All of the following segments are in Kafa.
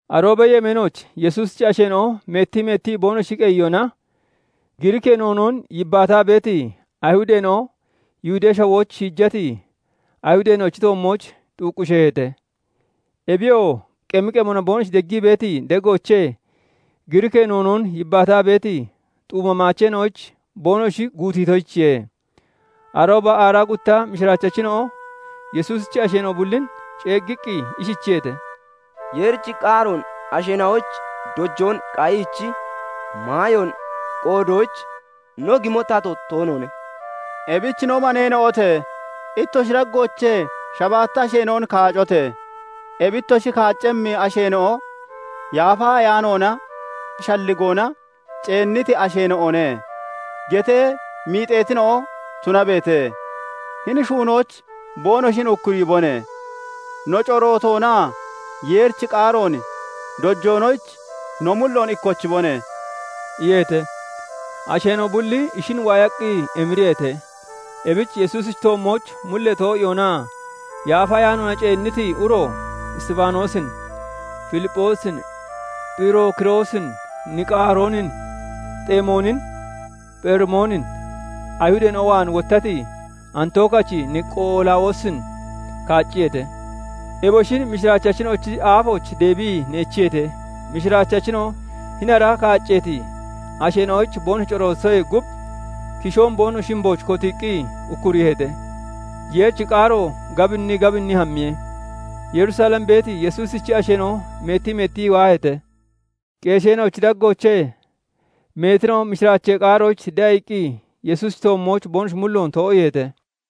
Aroobee yemeenooch Yesuusichi asheena'o meettii meettii boonoshi qeyiyona, Giriikee noonoon yibbaataa beeti Ayihudeena'o Yihudee Shawooch shiijati Ayihudeena'ochi toommooch xuuqqishiyeete. Ebiyoo qemi qemona boonoshi deggii beeti degoochee Giriikee noonoon yibbaataa beeti xuuma maacheena'oyich boonoshi guutiitoyichiye. Arooba aaraa gutta mishiraachachina'o Yesuusichi asheena'o bullin ceeggiqqi ishichiyeete:- "Yeerichi qaaroon asheena'oyich dojoon qayiichi maayoon qoodoyich no gimo tato toonoone. Ebich no maneena'ote! Ittoshi daggoochee shabaatta asheena'on kaacote! Ebi ittoshi kaaccemmi asheena'o 'Yaafa Ayaanoonaa shalligoona ceenniti asheena'one' getee miixeetina'o tunabeete; hini shuunoyich boonoshin ukkuriibone! No, corootoonaa Yeerichi qaaroon dojoonoyich no mulloon ikkochibone!" iyeete. Asheena'o bulli ishin waayaqqi emiriyeete. Ebich Yesuusichi toommooch mullee too'iyoonaa Yaafa Ayaanoona ceenniti uro Isxifaanoosin, Filipphoosin, Phirookiroosin, Niqaaroonin, Xemoonin, Pherimoonin, Ayihudeena'o waan wottati Antookachi Niqolaawiyoosin kaacciyeete. Eboshin mishiraachachina'ochi aafooch deebii neechiyeete. Mishiraachachina'o hini ara kaacceeti asheena'oyich boonoshi corootitoyee gub, kishoon boonoshi shimbooch kotiiqqi ukkuriiheete. Yeerichi qaaro gabinnii gabinnii hammiye; Yerusalem beeti Yesuusichi asheena'o meettii meettii waaheete. Qeesheena'ochi daggoochee meetina'o mishiraachee qaaroyich de'a iqqi Yesuusichi toommooch boonoshi mulloon too'iiheete.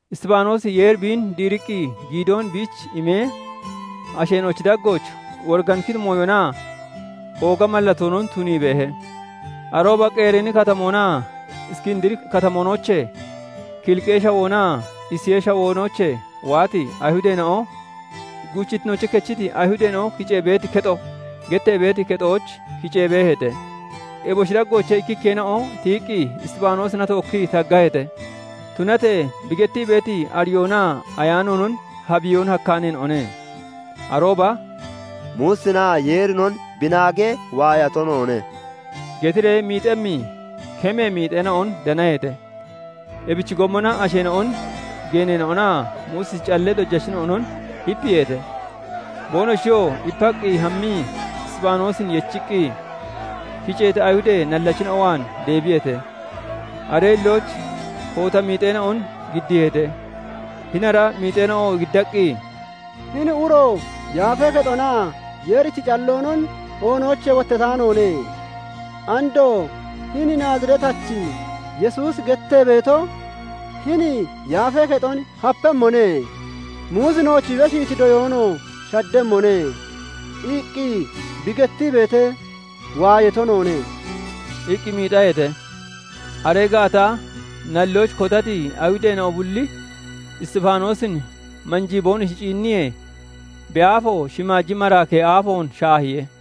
Isxifaanoosi Yeeri biin diiriqqi giidoon biich imee, asheena'ochi daggooch woriganikkiti mooyonaa ooga mallatoonon tunii beehe. Arooba Qereeni Katamoonaa Iskindiri Katamoonoochee, Kiliqee Shawoonaa Isiyee Shawoonoochee waati Ayihudeena'o "Guuchittinoochee kechiti Ayihudeena'o kicee beeti kexo" gettee beeti kexooch kicee beeheete. Eboshi daggoochee ikkikkeena'o tiyiqqi Isxifaanoosina tookkii taggaheete. Tunatee bi gettii beeti ariyoonaa ayaanoonon habbiyoon hakkaaneena'one. Arooba "Muusinaa Yeerinon bi naagee waayato noone" getiree miixemmi kemee miixeena'on danaheete. Ebichi gommona asheena'on, geeneena'onaa Muusichi callee dojachina'onon ipiiheete. Boonoshiyoo ipaqqi hammii Isxifaanoosin yechiqqi, kiceeti Ayihudee nallachina'o waan deebiyeete. Aree hillooch koota miixeena'on giddiiheete; hini ara miixeena'o giddaqqi, "Hini uro [hini] Yaafee Kexonaa Yeerichi calloonon oonoochee wottataanoone. Andoo 'Hini Naaziretachi Yesuusi gettee beeto, hini Yaafee Kexon hapemmone; Muusi nooch bi beshiiti doyoonoo shaddemmone' iqqi bi getee waayato noone" iqqi miixaheete. Aree gaata nalloyich kotati Ayihudeena'o bulli Isxifaanoosin manjii boonoshi ciinniyee, bi aafo shimaaji maraakee aafoon shaahiye.